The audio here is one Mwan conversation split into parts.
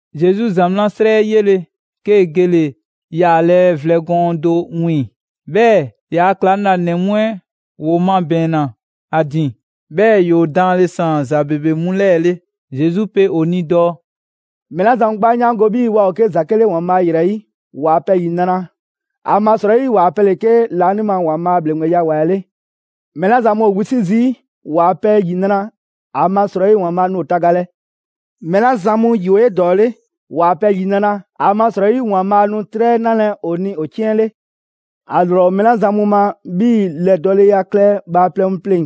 Zesu ‑zamaa' 'srɛ 'ɛ 'yele‑, 'kee‑ gele‑ yaalɛ vlɛ gɔɔn do 'wiiŋ‑. 'Bhɛɛ‑ ‑yaa' ‑klaŋlanɛ mu 'ɛ ‑woo mabɛɛnna ‑a ‑din, 'bhɛɛ‑ ‑yoo daanle ‑saan ‑za ‑bebe mu 'lɛɛ‑ 'le. Zesu pe ‑o ni dɔɔ: «Mɛɛ 'la zan mu 'gbu 'a 'yaango‑ 'bhii‑ waa ‑o 'ke ‑zake' 'le ‑Waanbhaa' ‑yrɛ 'yi, ‑waa' pɛ ‑yinra'! ‑Amasrɔyi ‑waa' pɛ ‑le 'ke laanima ‑Waanbhaa' ‑bhleŋgbeya ‑wa 'ɛ 'le. Mɛɛ 'la zan mu ‑o wisi' zii', ‑waa' pɛ ‑yinra'! ‑Amasrɔyi ‑Waanbhaa' nu ‑o tagalɛ. Mɛɛ 'la zan mu ‑yi ‑o 'edɔɔle, ‑waa' pɛ ‑yinra'! ‑Amasrɔyi ‑Waanbhaa' nu 'trɛ 'ɛ 'nalɛ‑ ‑o ni ‑o 'ciɛn 'le. ‑A ‑lrɔ ‑o mɛɛ la zan mu ma 'bhii‑ ‑lɛdɔɔleya klɛ bhaaplɛŋ mu pleŋ‑,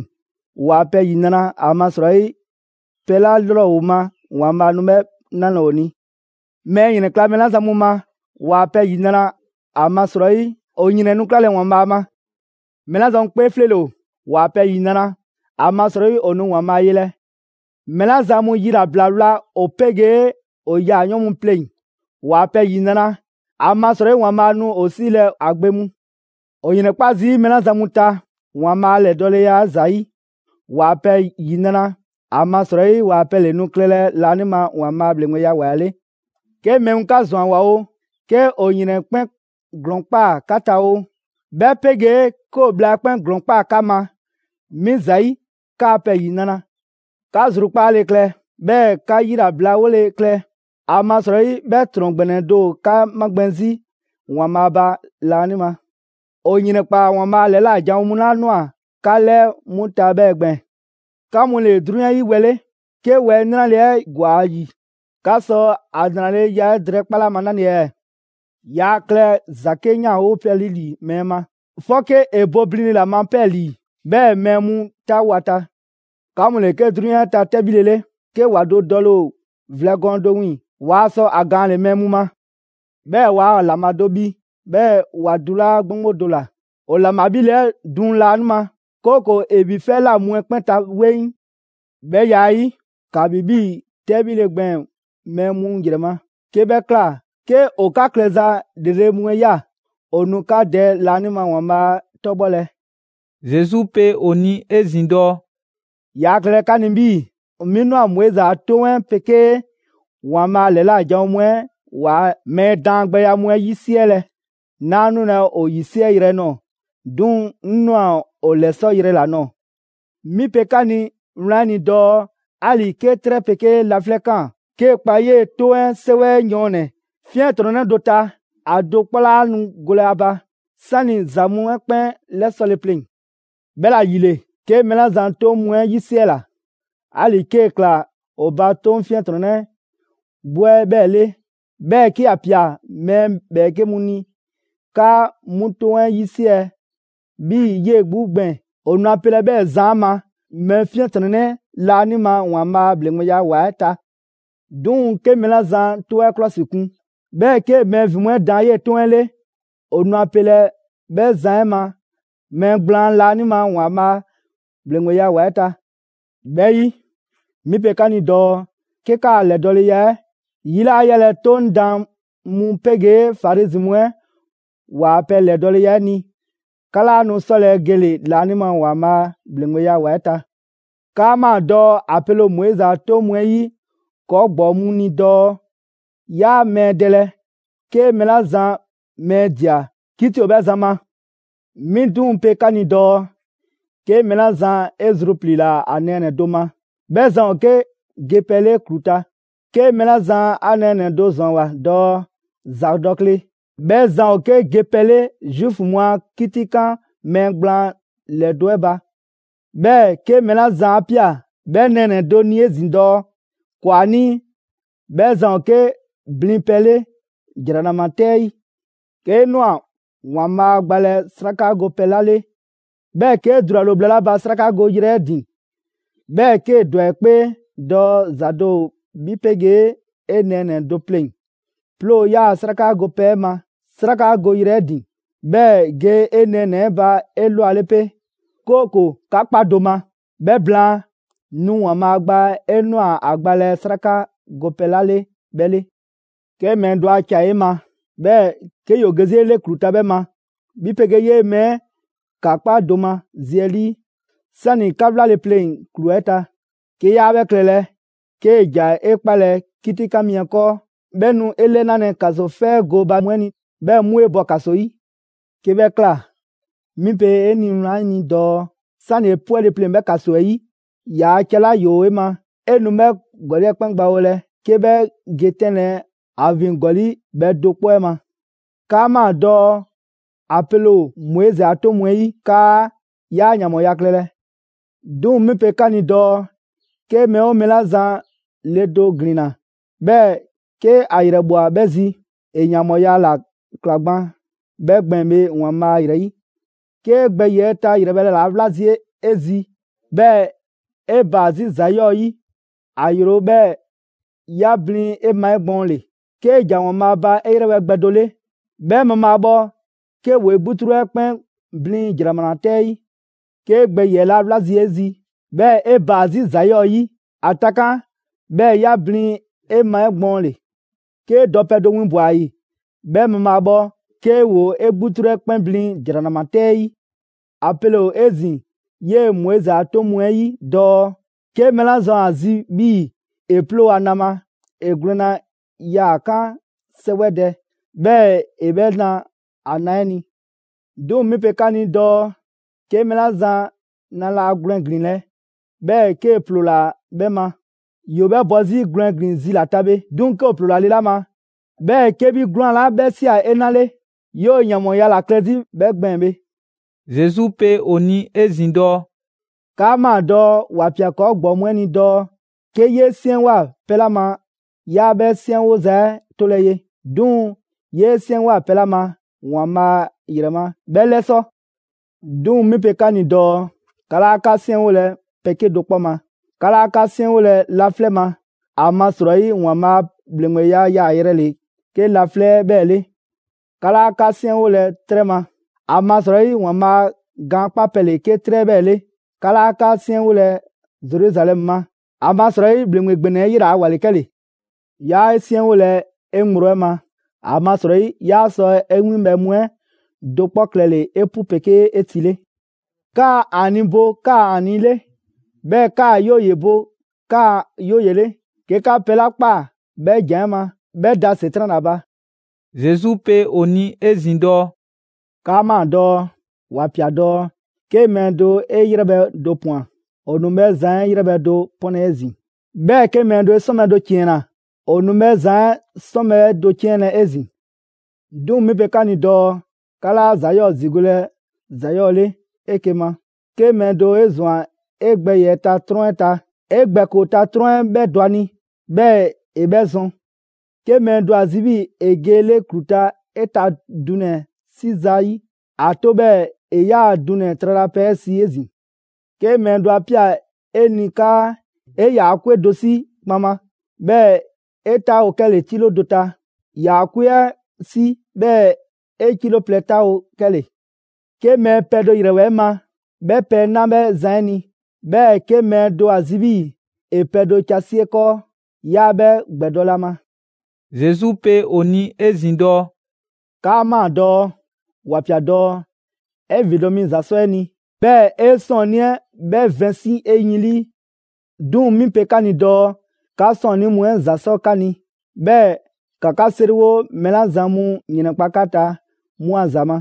‑waa' pɛ ‑yinra'! ‑Amasrɔyi pɛ 'la 'lrɔ ‑o ma, ‑Waanbhaa' nu 'bhɛ 'nalɛ‑ ‑o ni. Mɛɛ ‑yrɛnkla' mɛɛ 'la zan mu ma, ‑waa' pɛ ‑yinra'! ‑Amasrɔyi ‑o ‑yrɛn nu 'klalɛ‑ ‑Waanbhaa' ma! Mɛɛ 'la zan mu 'kpee 'fleele‑ ‑o, ‑waa' pɛ ‑yinra'! ‑Amasrɔyi ‑o nu ‑Waanbhaa' yelɛ! Mɛɛ 'la zan mu yilabla wla ‑o 'pegee ‑o yaayɔɔn' mu pleŋ‑, ‑waa' pɛ ‑yinra'! ‑Amasrɔyi ‑Waanbhaa' nu ‑o 'siilɛ‑ ‑a gbe mu! ‑O ‑yrɛnkpa' zii' mɛɛ 'la zan mu ta ‑Waanbhaa' a ‑lɛdɔɔleya 'ɛ ‑zayi', ‑waa' pɛ ‑yinra'! ‑Amasrɔyi ‑waa' pɛ ‑le nu klɛlɛ laanima ‑Waanbhaa' a ‑bhleŋgbeya ‑wa 'ɛ 'le! «'Ke mɛɛ mu 'ka ‑zwanwoa oo, 'ke ‑o ‑yrɛn 'ɛ 'kpɛn ‑glɔɔn ꞊kpaa 'ka ta oo; 'bhɛ 'pegee 'ke ‑o bhla 'ɛ 'kpɛn ‑glɔɔn ꞊kpaa 'ka ma, 'mi ‑zayi', 'kaa‑ pɛ ‑yinra'! 'Ka zrukpaale klɛ, 'bhɛɛ‑ 'ka 'yilabla 'wole‑ klɛ; ‑amasrɔyi 'bhɛ ‑trɔn ‑gbɛnɛ do ‑o 'ka 'magbɛn‑ 'zi ‑Waanbhaa' ba laanima. ‑O ‑yrɛnkpaa ‑Waanbhaa' ‑lɛla' janwo mu 'la ꞊nwa 'ka 'lɛɛ 'mu ta 'bhɛɛ‑ gbɛɛn‑.» «'Ka mu ‑le 'drunyan 'ɛ 'yi wɛ 'le. 'Ke wɛ 'ɛ 'nranleya 'ɛ ‑gwa ‑a ‑yi, 'ka sɔ ‑a ‑nraleya 'ɛ drɛɛkpale 'a ma 'nale‑ ɛɛ? Yaa klɛ ‑za 'ke 'yanwopɛ 'le ‑li mɛɛ ma, 'fɔke ‑e bo blinle ‑la ma 'pɛɛlii‑, 'bhɛɛ‑ mɛɛ mu 'taawo‑ ‑a ta. 'Ka mu ‑le 'ke 'drunyan 'ɛ ta 'tɛbhile 'le. 'Ke ‑wa do dɔle‑ ‑o vlɛ gɔɔn do 'wiiŋ‑ waa sɔ ‑a gaanle‑ mɛɛ mu ma. 'Bhɛɛ‑ waa ‑laŋbha do bhi 'bhɛɛ‑ ‑wa dulaa' 'gboŋgbo do ‑la. ‑O ‑laŋbha 'bhile‑ 'ɛ duŋ laanima, 'kooko‑ ‑e bhi 'fɛ 'ɛ ꞊la mu 'ɛ 'kpɛn ta 'weŋ. 'Bhɛ ya 'ɛ 'yi, ‑ka ‑bhi 'bhii‑ 'tɛbhile gbɛɛn‑ mɛɛ mu ‑yrɛ ma. 'Ke 'bhɛ ꞊kla, 'ke ‑o 'ka klɛza ‑lrele' mu 'ɛ ꞊ya, ‑o nu 'ka Dɛ laanima ‑Waanbhaa' 'ɛ 'tɔbhɔlɛ.» Zesu pe ‑o ni 'ezin‑ dɔɔ: «Yaa klɛlɛ 'ka 'ni 'bhii‑ 'mi ꞊nwa Moizi a 'Toŋ 'ɛ 'pegee ‑Waanbhaa' ‑lɛla' janwo mu 'ɛ ‑waa' mɛɛ daangbɛya mu 'ɛ 'yisiɛlɛ! 'Naa 'nulɛ‑ ‑o ‑yisiɛyrɛ ꞊nɔɔ, 'duŋ‑ 'ŋ ꞊nwa ‑o ‑lɛsɔyrɛ ‑la ꞊nɔɔ. 'Mi pe 'ka ni wlan 'ɛ ni dɔɔ 'ali‑ 'ke 'trɛ 'pegee laflɛ' ꞊kaan, 'kee‑ kpa 'yee‑ 'toŋ 'ɛ 'sɛwɛ 'ɛ yɔɔnnɛ‑ 'fiɛntrɔnnɛ do ta, ‑a do 'kpɔ 'laa nu golɛ ‑a ba, 'sani‑ ‑za mu 'ɛ 'kpɛn 'lɛsɔle pleŋ‑. 'Bhɛla‑ ‑yile, 'ke mɛɛ 'la zan 'toŋ mu 'ɛ 'yisiɛla, 'ali‑ 'kee‑ ꞊kla ‑o ba 'toŋ 'fiɛntrɔnnɛ 'gbu 'ɛ 'bhɛɛ‑ 'le; 'bhɛɛ‑ 'ke ‑ya ‑pia mɛɛ ‑bhɛɛke' mu ni 'kaa 'mu 'toŋ 'ɛ 'yisiɛ‑ 'bhii‑ 'yee‑ 'gbu gbɛɛn‑; ‑o nu a pelɛ 'bhɛɛ‑ zan 'ɛ ma mɛɛ 'fiɛntrɔnnɛ laanima ‑Waanbhaa' ‑bhleŋgbeya ‑wa 'ɛ ta. 'Duŋ‑ 'ke mɛɛ 'la zan 'Toŋ 'ɛ 'klɔsikun, 'bhɛɛ‑ 'kee‑ mɛɛ ‑vin mu 'ɛ daan 'yee‑ 'Toŋ 'ɛ 'le, ‑o nu a pelɛ 'bhɛɛ‑ zan 'ɛ ma mɛɛ gblaan laanima ‑Waanbhaa' ‑bhleŋgbeya ‑wa 'ɛ ta. 'Bhɛ 'yi, 'mi pe 'ka ni dɔɔ 'ke 'kaa‑ ‑lɛdɔɔleya 'ɛ 'yi laa yalɛ 'Toŋ daan mu 'pegee Farizi mu 'ɛ ‑waa' pɛ ‑lɛdɔɔleya 'ɛ ni, 'ka 'laa nu 'sɔlɛ‑ gele‑ laanima ‑Waanbhaa' ‑bhleŋgbeya ‑wa 'ɛ ta.» «'Kaa ꞊maa dɔɔ ‑a pele ‑o Moizi a 'toŋ mu 'ɛ 'yi ‑kɔɔ' ‑gbɔɔ mu ni dɔɔ: ‹Yaa mɛɛ dɛlɛ;› 'ke mɛɛ 'la zan mɛɛ ꞊dia, 'kiti ‑o 'bhɛ zan ma. 'Mi 'duŋ‑ pe 'ka ni dɔɔ: 'Ke mɛɛ 'la zan 'e zrupliila ‑a nɛɛnɛ‑ do ma, 'bhɛ zan ‑o 'ke gepɛ 'le ‑klu ta. 'Ke mɛɛ 'la zan 'a nɛɛnɛ‑ do ‑zwanwoa dɔɔ: ‹‑Zadɔkle,› 'bhɛ zan ‑o 'ke gepɛ 'le Zuufu mu a 'kitikan mɛɛ gblaan ‑lɛdo' 'ɛ ba. 'Bhɛɛ‑ 'ke mɛɛ 'la zan 'a ꞊pia 'bhɛ nɛɛnɛ‑ do ni 'ezin‑ dɔɔ: ‹‑Kwanii'›, 'bhɛ zan ‑o 'ke blinpɛ 'le ‑jranama 'tɛ 'ɛ 'yi. 'Kee ꞊nwa ‑Waanbhaa' gbalɛ 'sraka gopɛ 'la 'le, 'bhɛɛ‑ 'kee dulale ‑o bhla 'la ba 'srakagoyrɛ 'ɛ ‑din, 'bhɛɛ‑ 'kee‑ ‑dwa 'e 'kpee dɔɔ ‑za do ‑o 'bhi 'pegee 'e nɛɛnɛ‑ do pleŋ‑, 'ploo‑ 'yaa‑ 'sraka gopɛ 'ɛ ma 'srakagoyrɛ 'ɛ ‑din, 'bhɛɛ‑ ge 'e nɛɛnɛ‑ 'ɛ ba 'elwale 'pe, 'kooko‑ 'ka kpa do ma; 'bhɛ blaan, nu ‑Waanbhaa' gba 'e ꞊nwa ‑a gbalɛ 'sraka gopɛ 'la 'le 'bhɛ 'le. «'Ke mɛɛ do a ca ‑o 'e ma, 'bhɛɛ‑ 'ke ‑yoo ge 'zi 'e 'le ‑klu ta 'bhɛ ma, 'bhi 'pegee 'yee‑ mɛɛ 'ɛ ‑ka 'kpa do ma zi 'ɛ 'lii, 'sani‑ 'ka 'wlale‑ pleŋ‑ ‑klu 'ɛ ta. 'Ke 'yaa 'bhɛ klɛlɛ, 'kee‑ ‑ja 'e 'kpalɛ‑ 'kitikan mi 'ɛ 'kɔɔ; 'bhɛ nu 'e 'lɛnalɛ ‑kasofɛ gooba mu 'ɛ ni, 'bhɛɛ‑ 'mu 'e bɔ ‑kaso 'yi. 'Ke 'bhɛ ꞊kla, 'mi pe 'e ni wlan 'ɛ ni dɔɔ: 'Sani‑ 'e 'pwɛle‑ pleŋ‑ 'bhɛ ‑kaso 'ɛ 'yi; ‑yaa' ca 'la ‑yoo 'e ma 'e nu 'bhɛ ‑gɔli' 'ɛ 'kpɛn gbawolɛ 'ke 'bhɛ ge 'tɛnlɛ‑ ‑a ‑vin ‑gɔli' bhɛ do 'kpɔ 'ɛ ma.» «'Kaa ꞊maa dɔɔ ‑a pele ‑o Moizi a 'toŋ mu 'ɛ 'yi 'kaa: ‹'Yaa ‑yanbhɔɔya klɛlɛ.› 'Duŋ‑ 'mi pe 'ka ni dɔɔ: 'Ke mɛɛ 'oo mɛɛ 'la zan le do ‑glinna, 'bhɛɛ‑ 'ke ‑a ‑yrɛbhwa 'bhɛ 'zi, ‑e ‑yanbhɔɔya ‑la ꞊kla gban 'bhɛ gbɛɛn‑ bhe ‑Waanbhaa' ‑yrɛ 'yi. 'Kee‑ gbɛ ‑yiɛ' ta ‑yrɛbhɛ' ‑le ‑a wla 'zi 'e zi 'bhɛɛ‑ 'e baa‑ 'zi ‑za 'yɔɔ‑ 'yi, ‑a ‑yro, 'bhɛɛ‑ 'ya blin 'e ma 'egbɔɔnle. 'Kee‑ ‑ja ‑Waanbhaa' ba 'e 'yrɛbhɛ‑ gbɛ do 'le, 'bhɛ mabhaabhɔ 'ke ‑woo 'e 'gbutru 'ɛ 'kpɛn blin ‑jranama 'tɛ 'ɛ 'yi. 'Kee gbɛ ‑yiɛ' ‑le ‑a wla 'zi 'e zi 'bhɛɛ‑ 'e baa‑ 'zi ‑za 'yɔɔ‑ 'yi, ‑a takan' 'bhɛɛ‑ 'ya blin 'e ma 'egbɔɔnle. 'Kee dɔpɛ do winbwa‑ ‑a ‑yi 'bhɛ mabhaabhɔ, 'ke ‑woo 'e 'gbutru 'ɛ 'kpɛn blin ‑jranama 'tɛ 'ɛ 'yi.» «‑A pele ‑o 'ezin‑ 'yee‑ Moizi a 'toŋ mu 'ɛ 'yi dɔɔ: ‹'Ke mɛɛ 'la zan ‑o ‑a zi 'bhii‑ ‑e 'ploo‑ ‑a na ma, ‑e gwlɛnna yaa‑ 'kan 'sɛwɛdɛ, 'bhɛɛ‑ ‑e 'bhɛ na ‑a na 'ɛ ni.› 'Duŋ‑ mi pe 'ka ni dɔɔ: 'Ke mɛɛ 'la zan na 'laa gwlɛn ‑glinlɛ', 'bhɛɛ‑ 'kee‑ ‑ploola 'bhɛ ma, ‑yoo 'bhɛ bɔ 'zi gwlɛn ‑glin zi ‑la ta bhe. 'Duŋ‑ 'ke ‑o ‑ploola le 'la ma, 'bhɛɛ‑ 'ke 'bhi 'gwlaan‑ 'la 'bhɛ ꞊sia 'e 'na 'le, 'yoo‑ ‑yanbhɔɔya ‑la klɛ 'zi 'bhɛ gbɛɛn‑ bhe.» Zesu pe ‑o ni 'ezin‑ dɔɔ: «'Kaa ꞊maa dɔɔ ‑wa ꞊pia ‑kɔɔ' ‑gbɔɔ mu 'ɛ ni dɔɔ: ‹'Ke 'yee 'siɛnwoa‑ pɛ 'la ma 'yaa 'bhɛ 'siɛnwoza 'ɛ 'tolɛ‑ ye, 'duŋ‑ 'yee 'siɛnwoa‑ pɛ 'la ma ‑Waanbhaa' ‑yrɛ ma, 'bhɛ 'lɛsɔ.› 'Duŋ‑ mi pe 'ka ni dɔɔ: 'Ka 'laa 'ka 'siɛnwolɛ pɛ 'kedo‑ 'kpɔ ma: 'Ka 'laa 'ka 'siɛnwolɛ laflɛ' ma, ‑amasrɔyi ‑Waanbhaa' a ‑bhleŋgbeya yaayrɛ ‑le 'ke laflɛ' 'ɛ 'bhɛɛ‑ 'le; 'ka 'laa 'ka 'siɛnwolɛ 'trɛ ma, ‑amasrɔyi ‑Waanbhaa' gaankpapɛ ‑le 'ke 'trɛ 'ɛ 'bhɛɛ‑ 'le; 'ka 'laa 'ka 'siɛnwolɛ Zeruzalɛmu ma, ‑amasrɔyi ‑bhleŋgbe ‑gbɛnɛ 'ɛ 'yela‑ a ‑wa ‑le 'kɛle‑. 'Yaa 'e 'siɛnwolɛ 'e ŋgblo 'ɛ ma, ‑amasrɔyi 'yaa sɔ 'e winbhɛ mu 'ɛ do 'kpɔ klɛle‑ 'epu 'pegee 'etile. 'Kaa ‹‑Aani'› bo 'kaa‑ ‹‑Aani'› 'le, 'bhɛɛ‑ 'kaa‑ ‹'Yooye‑› bo 'kaa‑ ‹'Yooye‑› 'le. 'Ke 'ka pɛ 'la ꞊kpaa 'bhɛ ‑jan 'ɛ ma, 'bhɛ da ‑Setran' ‑la ba.» Zesu pe ‑o ni 'ezin‑ dɔɔ: «'Kaa ꞊maa dɔɔ ‑wa ꞊pia dɔɔ: ‹'Ke mɛɛ do 'e 'yrɛbhɛ‑ do ꞊pwan, ‑o nu 'bhɛ zan 'ɛ 'yrɛbhɛ‑ do 'pɔnlɛ‑ 'ezin‑; 'bhɛɛ‑ 'ke mɛɛ do 'e 'sɔnbhɛ‑ do 'ciɛnna‑, ‑o nu 'bhɛ zan 'ɛ 'sɔnbhɛ‑ do 'ciɛnlɛ‑ 'ezin‑.› 'Duŋ‑ 'mi pe 'ka ni dɔɔ: 'Ka 'laa ‑za 'yɔɔ‑ ‑zigolɛ ‑za 'yɔɔ‑ 'le 'eke‑ ma. 'Ke mɛɛ do 'e ꞊zwan 'e gbɛ ‑yiɛ' ta 'trɔn 'ɛ ta, 'e gbɛ ‑koo ta 'trɔn 'ɛ 'bhɛ dɔ ‑a ni 'bhɛɛ‑ ‑e 'bhɛ zɔn. 'Ke mɛɛ do ‑a zi 'bhii‑ ‑e ge 'e 'le ‑klu ta 'e ta dunɛ‑ 'ɛ 'si zayi', ‑a 'to 'bhɛɛ‑ ‑e 'yaa‑ dunɛ‑ tralapɛ 'ɛ si 'ezin‑. 'Ke mɛɛ do 'a ꞊pia 'e ni 'kaa ‑e ‑yaa' 'kwe do 'si kpaŋma, 'bhɛɛ‑ 'e 'taawo‑ 'kɛle‑ 'kilo do ta, ‑yaa' 'kwe 'ɛ 'si, 'bhɛɛ‑ 'e 'kilo plɛ ta 'taawo‑ 'kɛle‑. 'Ke mɛɛ pɛ do ‑yrɛwoa 'e ma, 'bhɛ pɛ 'ɛ 'na 'bhɛ zan 'ɛ ni; 'bhɛɛ‑ 'ke mɛɛ do ‑o ‑a zi 'bhii‑ ‑e pɛ do ca si 'e 'kɔɔ, 'yaa 'bhɛ ‑gbɛdɔlɛ ‑a ma.» Zesu pe ‑o ni 'ezin‑ dɔɔ: «'Kaa ꞊maa dɔɔ ‑wa ꞊pia dɔɔ: ‹'E ‑vindo' mi ‑za 'sɔ 'e ni, 'bhɛɛ‑ 'e 'sɔɔnnii 'ɛ 'bhɛ vɛnsi' 'e yin 'lii.› 'Duŋ‑ 'mi pe 'ka ni dɔɔ: 'Ka 'sɔɔnnii mu 'ɛ ‑za 'sɔ 'ka ni; 'bhɛɛ‑ ‑ka 'ka 'seriwo mɛɛ 'la zan mu ‑yrɛnkpa' 'ka ta 'mu a ‑za ma.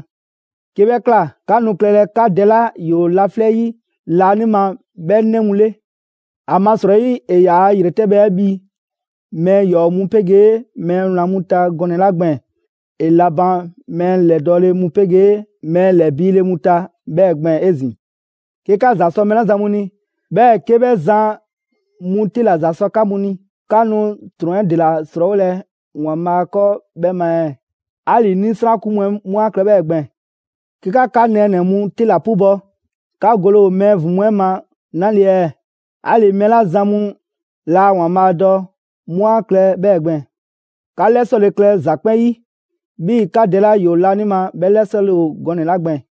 'Ke 'bhɛ ꞊kla, 'ka nu klɛlɛ 'ka Dɛ 'la ‑yoo laflɛ' 'yi laanima 'bhɛ 'nɛ mu 'le. ‑Amasrɔyi ‑e ‑yaa' ‑yretɛbhɛ 'ɛ bhi mɛɛ ‑yɔɔ' mu 'pegee mɛɛ wlan mu ta gɔnɛ‑ 'la gbɛɛn‑; ‑e la ban mɛɛ ‑lɛdɔɔle mu 'pegee mɛɛ ‑lɛbiile mu ta 'bhɛɛ‑ gbɛɛn‑ 'ezin‑. 'Ke 'ka ‑za 'sɔ mɛɛ 'la zan mu ni, 'bhɛɛ‑ 'ke 'bhɛ zan mu 'te ‑la ‑za 'sɔ 'ka mu ni. 'Ka nu ‑trɔn 'ɛ ‑dela 'srɔɔwolɛ ‑Waanbhaa' 'kɔɔ 'bhɛ ma ɛɛ? 'Ali‑ 'nisrakun mu 'ɛ 'mu 'a klɛ 'bhɛɛ‑ gbɛɛn‑. 'Ke 'ka 'ka nɛɛnɛ‑ mu 'te ‑la 'pubɔ‑, 'ka gole ‑o mɛɛ ‑vin mu 'ɛ ‑o ma 'nale‑ ɛɛ? 'Ali‑ mɛɛ 'la zan mu laa ‑Waanbhaa' dɔ, 'mu 'a klɛ 'bhɛɛ‑ gbɛɛn‑. 'Ka 'lɛsɔle klɛ ‑za 'kpɛn 'yi, 'bhii‑ 'ka Dɛ 'la ‑yoo laanima 'bhɛ 'lɛsɔle ‑o gɔnɛ‑ 'la gbɛɛn‑.»